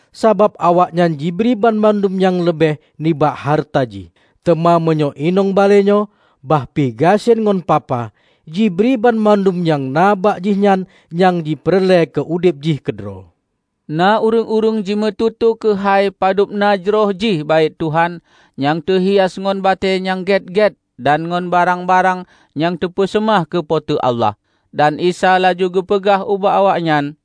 Sabab awaknyan jibri banmandum nyang leubeh nibak hareuta jih. Teuma meunyoe inong balée nyoe, bah pih gasien ngon papa, jibri banmandum nyang na bak jihnyan nyang jipeureulée keu udeb jih keudroe." Na ureuëng-ureuëng jimeututoe keuhai padubna jroh jih Baét Tuhan nyang teuhias ngon batée nyang gét-gét dan ngon barang-barang nyang teupeuseumah keu Po teu Allah. Dan Isa laju geupeugah ubak awaknyan,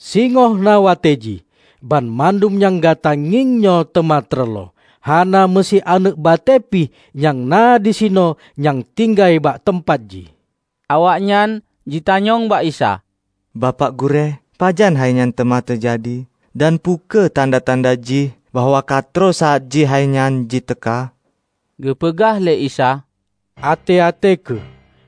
"Singoh na watée jih, banmandum nyang gata ngieng nyoe teuma teureuloh; hana meusi aneuëk batée pih nyang na disinoe nyang tinggai bak teumpat jih!" Awaknyan jitanyong bak Isa, "Bapak Gurée, pajan hainyan teuma teujadi? Dan peu kheueh tanda-tanda jih bahwa katroh saát jih hainyan ji teuka?" Geupeugah lé Isa, "Até-até kheueh,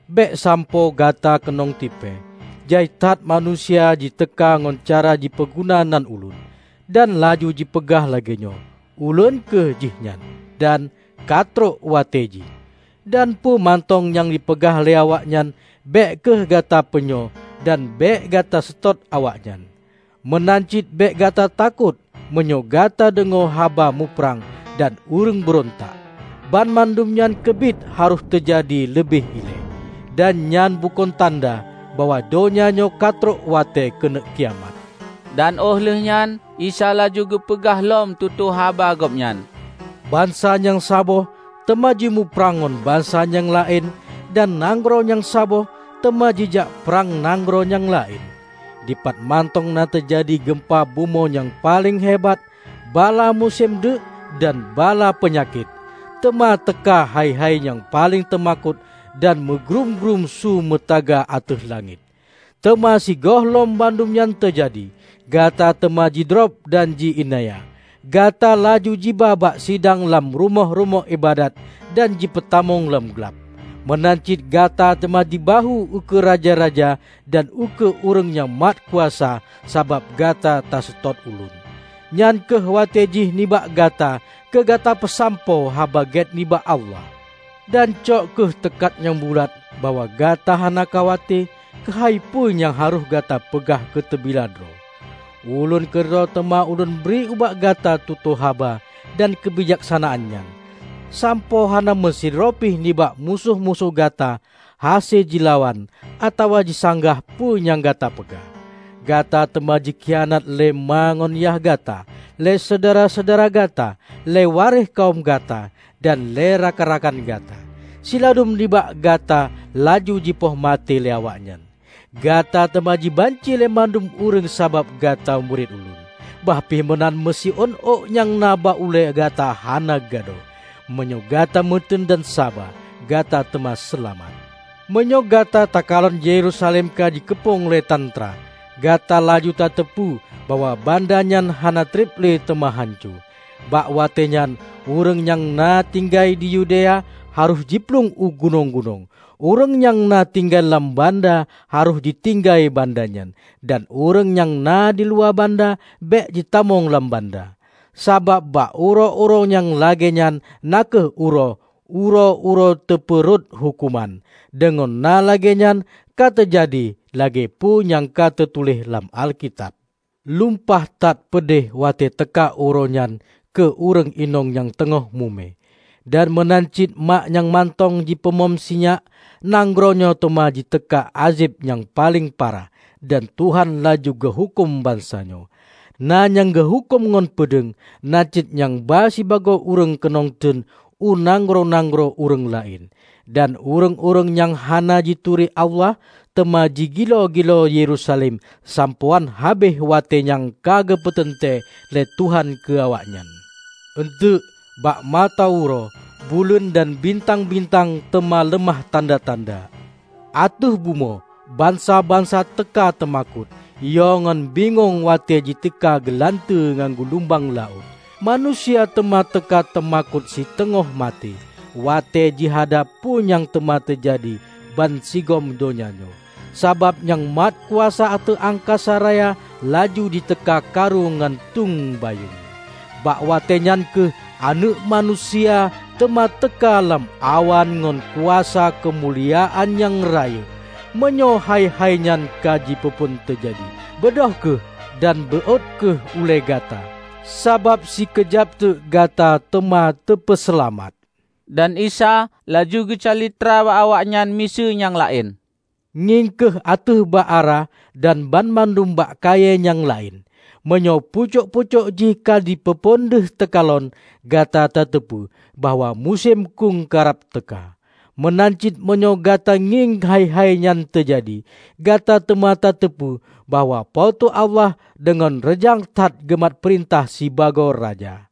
bék sampoe gata keunong tipée. Jai that manusia jiteuka ngon cara jipeuguna nan Ulôn, dan laju jipeugah lagée nyoe, 'Ulôn kheueh jihnyan!' dan 'Katrok watée jih.' Dan peue mantong nyang jipeugah lé awaknyan bék kheueh gata peunyoe dan bék gata seutôt awaknyan. Meunan cit bék gata takot meunyoe gata deungoe haba muprang dan ureuëng beurontak. Banmandum nyan keubiet harôh teujadi leubeh ilée. Dan nyan bukon tanda bahwa donya nyoe ka trok watée keuneuk kiamat." Dan óh lheueh nyan Isa laju geupeugah lom tutoe haba Gobnyan, "Bansa nyang saboh teuma jimuprang ngon bansa nyang laén dan nanggroe nyang saboh teuma jijak prang nanggroe nyang laén. Dipatmantong na teujadi geumpa bumoe nyang paleng hebat, bala musém deuk dan bala peunyakét. Teuma teuka hai-hai nyang paleng teumakot dan meugrúm-grúm su meutaga ateueh langét. Teuma sigohlom bandum nyan teujadi, gata teuma jidrob dan ji iénanya. Gata laju jiba bak sidang lam rumoh-rumoh iébadat dan jipeutamong lam glab. Meunan cit gata teuma jibahue ukeue raja-raja dan ukeue ureuëng nyang mat kuasa sabab gata taseutôt Ulôn. Nyan kheueh watée jih nibak gata keu gata peusampoe Haba Gét nibak Allah. Dan cok kheueh teukat nyang bulat bahwa gata hana khawate keuhai peue nyang harôh gata peugah keu teubila droe. Ulôn keudroe teuma ulôn bri ubak gata tutoe haba dan keubijaksanaan nyan, sampoe hana meusidroe pih nibak musoh-musoh gata hase jilawan atawa jisanggah peue nyang gata peugah. Gata teuma jikhianat lé ma ngon yah gata, lé syedara-syedara gata, lé waréh kawöm gata dan lé rakan-rakan gata. Siladum nibak gata laju jipoh maté lé awaknyan. Gata teuma jibanci lé mandum ureuëng sabab gata murit Ulôn. Bah pih meunan meusiôn ôk nyang na bak ulée gata hana gadôh. Meunyoe gata meuteun dan saba, gata teuma seulamat." "Meunyoe gata takalon Yerusalem ka jikeupông lé tantra, gata laju tateupeue bahwa banda nyan hana treb le teuma hanco. Bak watée nyan ureuëng nyang na tinggai di Yudea harôh jiplueng u gunong-gunong. Ureuëng nyang na tinggai lam banda harôh jitinggai banda nyan, dan ureuëng nyang na diluwa banda bék jitamong lam banda. Sabab bak uroe-uroe nyang lagée nyan na kheueh uroe 'Uroe-uroe teupeu rhot Huköman'. Deungon na lagée nyan ka teujadi lagée peue nyang ka teutuléh lam Alkitab. Lumpah that peudeh watée teuka uroe nyan keue ureuëng inong nyang teungoh mume, dan meunan cit mak nyang mantong jipeumom sinyak! Nanggroe nyoe teuma jiteuka ázeb nyang paleng parah, dan Tuhan laju geuhuköm bansa nyoe. Na nyang geuhuköm ngon peudeueng, na cit nyang ba sibagoe ureuëng keunong teuen u nanggroe-nanggroe ureuëng laén; dan ureuëng-ureuëng nyang hana jituri Allah teuma jigiloe-giloe Yerusalem sampoe án habéh watée nyang ka geupeuteuntée lé Tuhan keu awaknyan." "Eunteuk, bak mata uroe, buleuen dan bintang-bintang teuma leumah tanda-tanda. Ateueh bumoe, bansa-bansa teuka teumakot, yo ngon bingong watée jiteuka geulanteue ngon gulumbang laôt. Manusia teuma teuka teumakot siteungoh maté watée jihadab peue nyang teuma teujadi bansigom donya nyoe, sabab nyang mat kuasa ateueh angkasa raya laju jiteuka karu ngon teueng bayeueng. Bak watée nyan kheueh Aneuëk Manusia teuma teuka lam awan ngon kuasa keumuliaan nyang rayeuk. Meunyoe hai-hai nyan ka jipeuphon teujadi, beudôh kheueh dan beuôt kheueh ulée gata, sabab sikeujab teuk gata teuma teupeuseulamat." Dan Isa laju geucalitra bak awaknyan miseue nyang laén, "Ngieng kheueh ateueh bak ara dan banmandum bak kayée nyang laén. Meunyoe pucok-pucok jih ka jipeuphon deuh teukalon, gata tateupeue bahwa musém khueng karab teuka. Meunan cit meunyoe gata ngieng hai-hai nyan teujadi, gata teuma tateupeue bahwa Po teu Allah deungon reujang that geumat peurintah sibagoe Raja.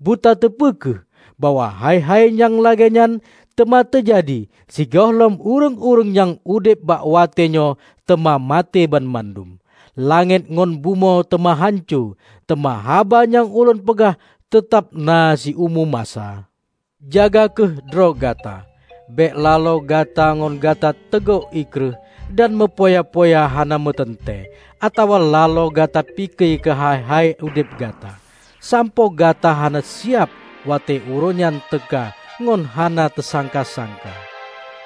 Butateupeue kheueh, bahwa hai-hai nyang lagée nyan teuma teujadi sigohlom ureuëng-ureuëng nyang udeb bak watée nyoe teuma maté banmandum. Langét ngon bumoe teuma hanco, teuma haba nyang Ulôn peugah teutab na siumu masa." "Jaga kheueh droe gata, bék laloe gata ngon gata teugok ié kreueh dan meupoya-poya hana meuteuntée, atawa laloe gata pike keuhai-hai udeb gata, sampoe gata hana siab watée uroe nyan teuka ngon hana teusangka-sangka.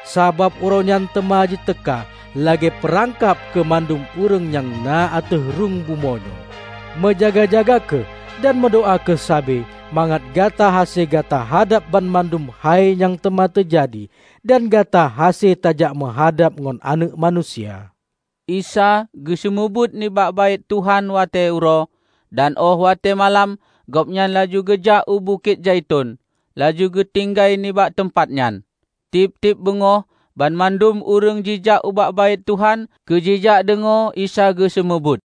Sabab Uroenyan teuma jiteuka lagée peurangkab keumandum ureuëng nyang na ateueh rhung bumoe nyoe. Meujaga-jaga kheueh, dan meudoá kheueh sabe mangat gata hase gata hadab banmandum hai nyang teuma teujadi dan gata hase tajakmeuhadab ngon Aneuëk Manusia." Isa geuseumeubeuet nibak Baét Tuhan watée uroe, dan óh watée malam Gobnyan laju geujak u Bukét Zaiton laju geutinggai nibak teumpat nyan. Tieb-tieb beungoh banmandum ureuëng jijak ubak Baét Tuhan keu jijak deungoe Isa geuseumeubeuet.